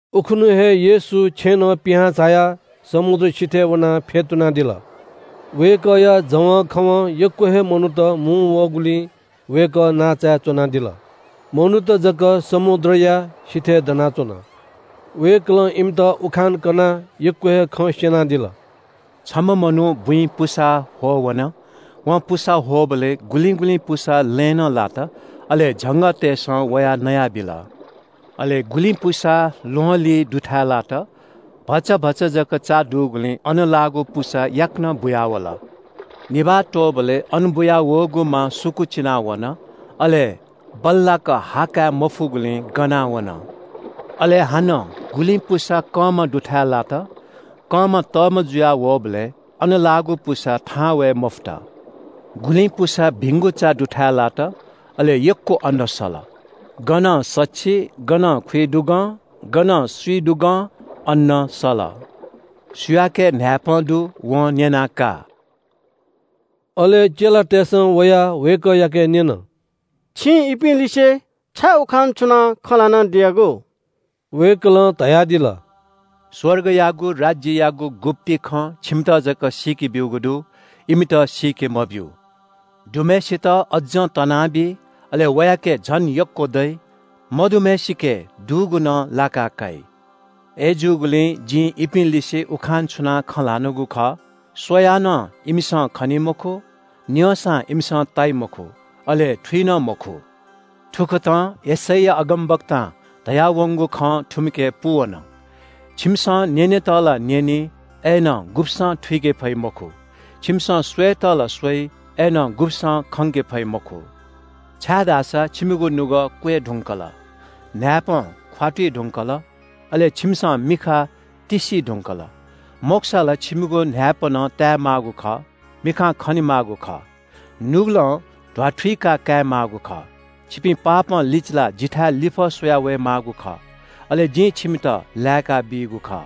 उखुन्‍हु हे येशू छेँनं पिहां झायाः समुद्र सिथय् वनाः फ्‍यतुनादिल। वय्‌कःया जवंखवं यक्‍व हे मनूत मुंवःगुलिं वय्‌कः नांचाय् च्‍वनादिल। मनूत जक समुद्रया सिथय् दनाच्‍वन। वय्‌कलं इमित उखान कनाः यक्‍व हे खँ स्‍यनादिल। “छम्‍ह मनू बुँइ पुसा ह्वः वन। वं पुसा ह्वःबलय् गुलिं गुलिं पुसा लँय् नं लात, अले झंगःतय्‌सं वयाः नयाबिल। अले गुलिं पुसा ल्‍वहंलिं दुथाय् लात। भचा भचा जक चा दुगुलिं अन लाःगु पुसा याकनं बुयावल। निभाः त्‍वःबलय् अन बुयावःगु मा सुकूचिना वन, अले बल्‍लाक हा काये मफुगुलिं गना वन। अले हानं गुलिं पुसा कंमा दुथाय् लात। कंमा तःमा जुया वःबलय् अन लाःगु पुसा थाहां वये मफुत। गुलिं पुसा भिंगु चा दुथाय् लात, अले यक्‍व अन्‍न सल। गनं सछि, गनं खुइदुगं, गनं स्‍विदुगं अन्‍न सल। सुयाके न्‍हाय्‌पं दु वं न्‍यनाः का।” अले चेलातय्‌सं वयाः वय्‌कःयाके न्‍यन – “छिं इपिं लिसे छाय् उखान छुनाः खँ ल्‍हानादियागु?” वय्‌कलं धयादिल – “स्‍वर्गयागु राज्‍ययागु गुप्‍ति खँ छिमित जक सीके ब्‍यूगु दु। इमित सीके मब्‍यू। दुम्‍हय्‌सित अज्‍जं तनाबी, अले वयाके झन यक्‍व दइ। मदुम्‍हय्‌सिके दुगु नं लाका काइ। अय्‌जूगुलिं जिं इपिं लिसे उखान छुनाः खँ ल्‍हानागु खः – “‘स्‍वयाः नं इमिसं खनी मखु, न्‍यंसां इमिसं ताइ मखु, अले थुइ नं मखु।’ “थुकथं यशैया अगमवक्तां धयावंगु खँ थुमिके पूवन – “‘छिमिसं न्‍यनेत ला न्‍यनी, अय्‌नं गुब्‍सं थुइके फइ मखु। छिमिसं स्‍वयेत ला स्‍वइ, अय्‌नं गुब्‍सं खंके फइ मखु। छाय्‌धाःसा छिमिगु नुगः क्‍वय् धुंकल, न्‍हाय्‌पं ख्‍वातुइ धुंकल, अले छिमिसं मिखा तिस्‍सी धुंकल। मखुसा ला छिमिगु न्‍हाय्‌पनं ताये माःगु खः, मिखां खने माःगु खः, नुगलं ध्‍वाथुइका काये माःगु खः। छिपिं पापं लिचिलाः जिथाय् लिफः स्‍वया वये माःगु खः, अले जिं छिमित लाय्‌काबीगु खः।’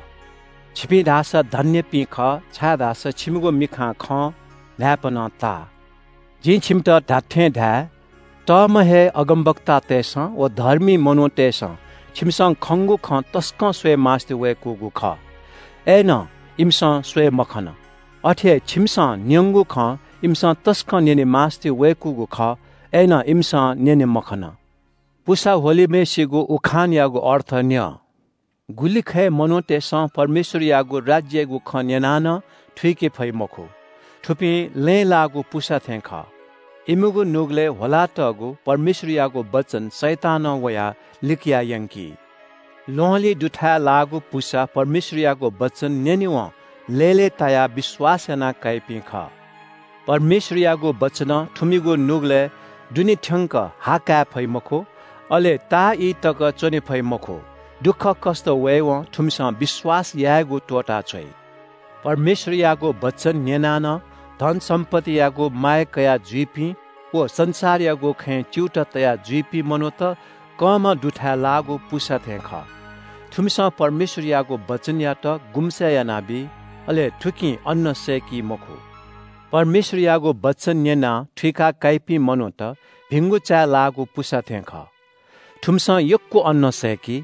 “छिपिं धाःसा धन्‍यपिं खः, छाय्‌धाःसा छिमिगु मिखां खं, न्‍हाय्‌पनं ता। जिं छिमित धात्‍थें धाये – तःम्‍ह हे अगमवक्तातय्‌सं व धर्मी मनूतय्‌सं छिमिसं खंगु खँ तसकं स्‍वये मास्‍तिवय्‌कूगु खः, अय्‌नं इमिसं स्‍वये मखन। अथे हे छिमिसं न्‍यंगु खँ इमिसं तसकं न्‍यने मास्‍तिवय्‌कूगु खः, अय्‌नं इमिसं न्‍यने मखन। “पुसा ह्वलिम्‍हय्‌सिगु उखानयागु अर्थ न्‍यँ। गुलिखय् मनूतय्‌सं परमेश्‍वरयागु राज्‍ययागु खँ न्‍यनाः नं थुइके फइ मखु। थुपिं लँय् लाःगु पुसा थें खः। इमिगु नुगलय् ह्वलातःगु परमेश्‍वरयागु वचन शैतानं वयाः लिकया यंकी। ल्‍वहंलिं दुथाय् लाःगु पुसा परमेश्‍वरयागु वचन न्‍यनेवं लय्‌लय्‌तायाः विश्‍वास याना काइपिं खः। परमेश्‍वरयागु वचनं थुमिगु नुगलय् दुने थ्‍यंक हा काये फइ मखु। अले ताःई तक च्‍वने फइ मखु। दुःखकष्‍ट वयेवं थुमिसं विश्‍वास यायेगु त्‍वःताछ्वइ। परमेश्‍वरयागु वचन न्‍यनाः नं धन सम्‍पत्तियागु माया कयाजुइपिं व संसारयागु खँय् च्‍यूताः तया जुइपिं मनूत कंमा दुथाय् लाःगु पुसा थें खः। थुमिसं परमेश्‍वरयागु वचनयात गुम्‍से यानाबी। अले थुकिं अन्‍न सय्‌की मखु। परमेश्‍वरयागु वचन न्‍यनाः थुइका काइपिं मनूत भिंगु चाय् लाःगु पुसा थें खः। थुमिसं यक्‍व अन्‍न सय्‌की।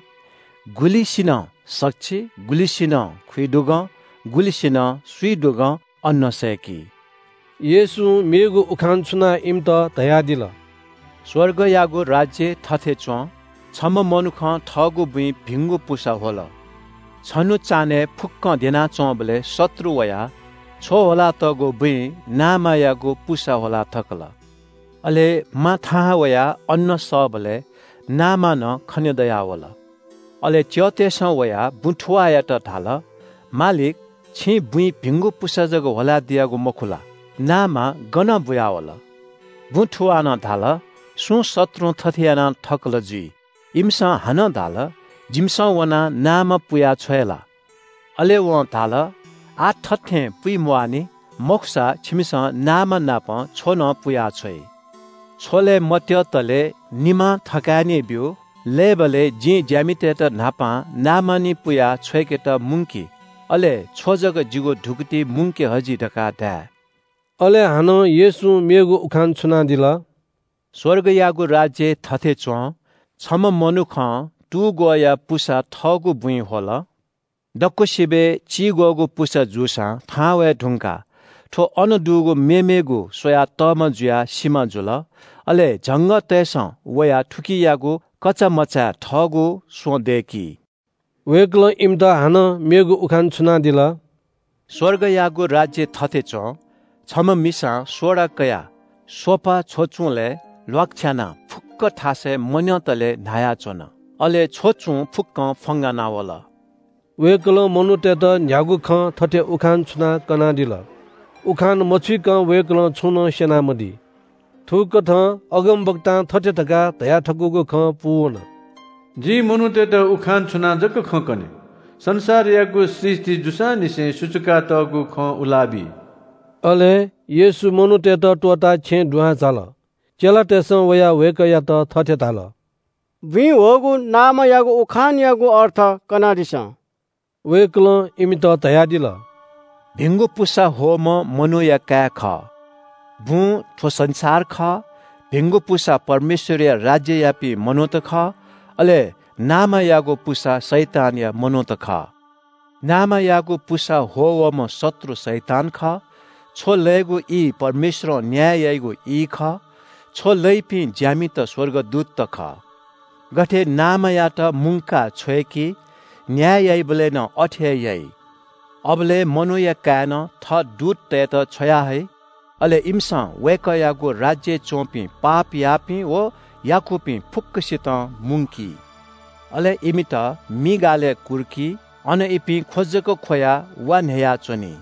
गुलिसिनं सछि, गुलिसिनं खुइदुगं, गुलिसिनं स्‍विदुगं अन्‍न सय्‌की।” येशूं मेगु उखान छुनाः इमित धयादिल – “स्‍वर्गयागु राज्‍य थथे च्‍वं – छम्‍ह मनुखं थःगु बुँइ भिंगु पुसा ह्वल। छन्‍हु चान्‍हय् फुक्‍कं द्यनाच्‍वंबलय् शत्रु वयाः छ्व ह्वलातःगु बुँइ नामायागु पुसा ह्वला थकल। अले मा थाहां वयाः अन्‍न सःबलय् नामा नं खनेदयावल। “अले च्‍यःतय्‌सं वयाः बुँ थुवाःयात धाल – ‘मालिक, छिं बुँइ भिंगु पुसा जक ह्वला दियागु मखु ला? नामा गनं बुयावल?’ “बुँ थुवालं धाल – ‘सुं शत्रुं थथे यानाथकल जुइ।’ इमिसं हानं धाल – ‘जिमिसं वनाः नामा पुया छ्वये ला?’ “अले वं धाल – ‘आः थथें पुइ म्‍वाःनि। मखुसा छिमिसं नामा नाप छ्व नं पुया छ्वइ। छ्व लये मत्‍यःतले निमां थकाय् नि ब्‍यु। लय्‌बलय् जिं ज्‍यामितय्‌त न्‍हापां नामा निं पुयाः छ्वय्‌केत मुंकि, अले छ्व जक जिगु धुकुतिइ मुंके हजि धकाः धाये।’” अले हानं येशूं मेगु उखान छुनादिल। “स्‍वर्गयागु राज्‍य थथे च्‍वं – छम्‍ह मनुखं तुग्‍वःया पुसा थःगु बुँइ ह्वल। दक्‍वसिबय् चिग्‍वःगु पुसा जूसां थाहां वये धुंकाः थ्‍व अन दुगु मेमेगु स्‍वयाः तःमा जुयाः सिमा जुल। अले झंगःतय्‌सं वयाः थुकियागु कचामचाय् थःगु स्‍वँ दय्‌की।” वय्‌कलं इमित हानं मेगु उखान छुनादिल – “स्‍वर्गयागु राज्‍य थथे च्‍वं – छम्‍ह मिसां सोडा कयाः स्‍वफा छ्वचुंलय् ल्‍वाकछ्यानाः फुक्‍क थासय् मन्‍यंतले न्‍हायाच्‍वन। अले छ्वचुं फुक्‍कं फ्‍वंगाना वल।” वय्‌कलं मनूतय्‌त न्‍ह्यागु खं थथे उखान छुनाः कनादिल। उखान मछुइकं वय्‌कलं छुं नं स्‍यनामदी। थुकथं अगमवक्तां थथे धकाः धयाथकूगु खँ पूवन – “जिं मनूतय्‌त उखान छुनाः जक खँ कने। संसारयागु सृष्‍टि जूसांनिसें सुचुकातःगु खँ उला बी।” अले येशू मनूतय्‌त त्‍वःताः छेँय् दुहां झाल। चेलातय्‌सं वयाः वय्‌कःयात थथे धाल – “बुँइ ह्वःगु नामायागु उखानयागु अर्थ कनादिसँ।” वय्‌कलं इमित धयादिल – “भिंगु पुसा ह्वःम्‍ह मनूया काय् खः। बुँ थ्‍व संसार खः। भिंगु पुसा परमेश्‍वरया राज्‍ययापिं मनूत खः। अले नामायागु पुसा शैतानया मनूत खः। नामायागु पुसा ह्वः वःम्‍ह शत्रु शैतान खः। छ्व लयेगु ई परमेश्‍वरं न्‍याय याइगु ई खः। छ्व लइपिं ज्‍यामित स्‍वर्गदूतत खः। “गथे नामायात मुंकाः छ्वय्‌की न्‍याय याइबलय् नं अथे हे याइ। अबलय् मनूया काय्‌नं थः दूततय्‌त छ्वयाहइ। अले इमिसं वय्‌कःयागु राज्‍यय् च्‍वंपिं पाप याःपिं व याकूपिं फुक्‍कसितं मुंकी। अले इमित मि गालय् कुर्की। अन इपिं ख्‍व जक ख्‍वयाः वा न्‍ह्ययाच्‍वनी।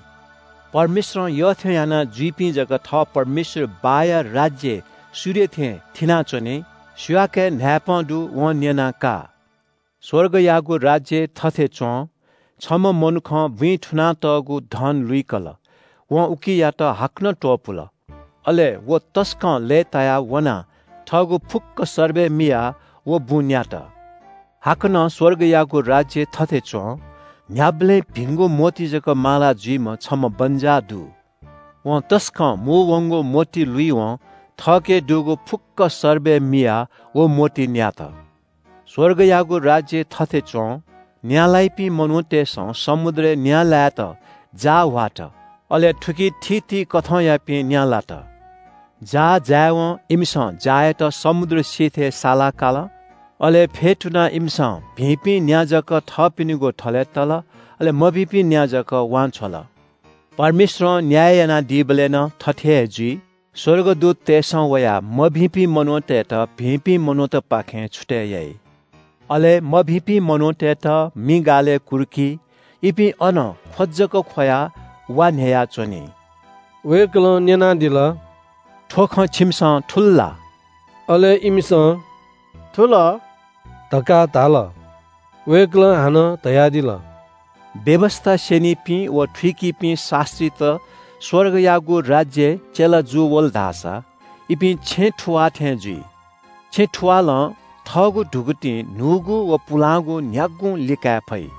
परमेश्‍वरं यःथें यानाजुइपिं जक थः परमेश्‍वर बाःया राज्‍यय् सूर्य थें थिनाच्‍वनी। सुयाके न्‍हाय्‌पं दु वं न्‍यनाः का।” “स्‍वर्गयागु राज्‍य थथे च्‍वं – छम्‍ह मनुखं बुँइ थुनातःगु धन लुइकल। वं उकियात हाकनं त्‍वपुल। अले व तसकं लय्‌तायाः वनाः थःगु फुक्‍क सर्बय मियाः व बुँ न्‍यात।” “हाकनं स्‍वर्गयागु राज्‍य थथे च्‍वं – न्‍ह्याबलें भिंगु मोती जक माला जुइम्‍ह छम्‍ह बन्‍जाः दु। वं तसकं मू वंगु मोती लुइवं थःके दुगु फुक्‍क सर्बय मियाः व मोती न्‍यात।” “स्‍वर्गयागु राज्‍य थथे च्‍वं – न्‍या लाइपिं मनूतय्‌सं समुद्रय् न्‍या लायेत जाः ह्वात। अले थुकी थीथी कथंयापिं न्‍या लात। जाः जायेवं इमिसं जाःयात समुद्र सिथय् साला काल। अले फ्‍यतुनाः इमिसं भिंपिं न्‍या जुक्‍व थःपिनिगु थलय् तल। अले मभिंपिं न्‍या जुक्‍व वांछ्वल। परमेश्‍वरं न्‍याय यानादीबलय् नं थथे हे जुइ। स्‍वर्गदूततय्‌सं वयाः मभिंपिं मनूतय्‌त भिंपिं मनूतपाखें छुतय् याइ। अले मभिंपिं मनूतय्‌त मि गालय् कुर्की। इपिं अन ख्‍व जक ख्‍वयाः वा न्‍ह्ययाच्‍वनी।” वय्‌कलं न्‍यनादिल – “थ्‍व खँ छिमिसं थुल ला?” अले इमिसं “थुल” धकाः धाल। वय्‌कलं हानं धयादिल – “व्‍यवस्‍था स्‍यनीपिं व थुइकीपिं शास्‍त्रीत स्‍वर्गयागु राज्‍यय् चेला जूवल धाःसा इपिं छेँ थुवाः थें जुइ। छेँ थुवालं थःगु धुकुतिं न्‍हूगु व पुलांगु न्‍ह्यागुं लिकाये फइ।”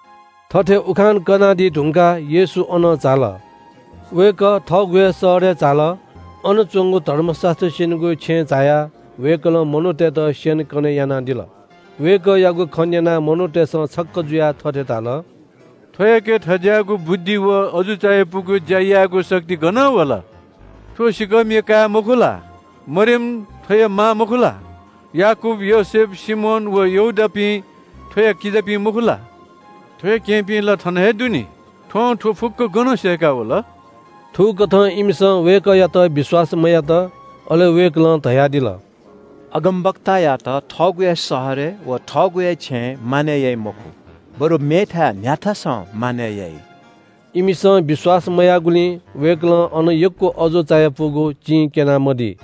थथे उखान कनादी धुंकाः येशू अनं झाल। वय्‌कः थःगु हे शहरय् झाल। अन च्‍वंगु धर्मशास्‍त्र स्‍यनीगु छेँय् झायाः वय्‌कलं मनूतय्‌त स्‍यनेकने यानादिल। वय्‌कःयागु खँ न्‍यनाः मनूतय्‌सं छक्‍क जुयाः थथे धाल – “थ्‍वयाके थज्‍याःगु बुद्धि व अजू चायापुगु ज्‍या यायेगु शक्ति गनं वल? थ्‍व सिँकःमिया काय् मखु ला? मरियम थ्‍वया मां मखु ला? याकूब, योसेफ, सिमोन व यहूदापिं थ्‍वया किजापिं मखु ला? थ्‍वया केहेँपिं ला थन हे दु नि? थ्‍वं थ्‍व फुक्‍कं गनं सय्‌काः वल?” थुकथं इमिसं वय्‌कःयात विश्‍वास मयात। अले वय्‌कलं धयादिल – “अगमवक्तायात थःगु हे शहरय् व थःगु हे छेँय् मानय् याइ मखु, बरु मेथाय् न्‍ह्याथासं मानय् याइ।” इमिसं विश्‍वास मयाःगुलिं वय्‌कलं अन यक्‍व अजू चायापुगु चिं क्‍यना मदी।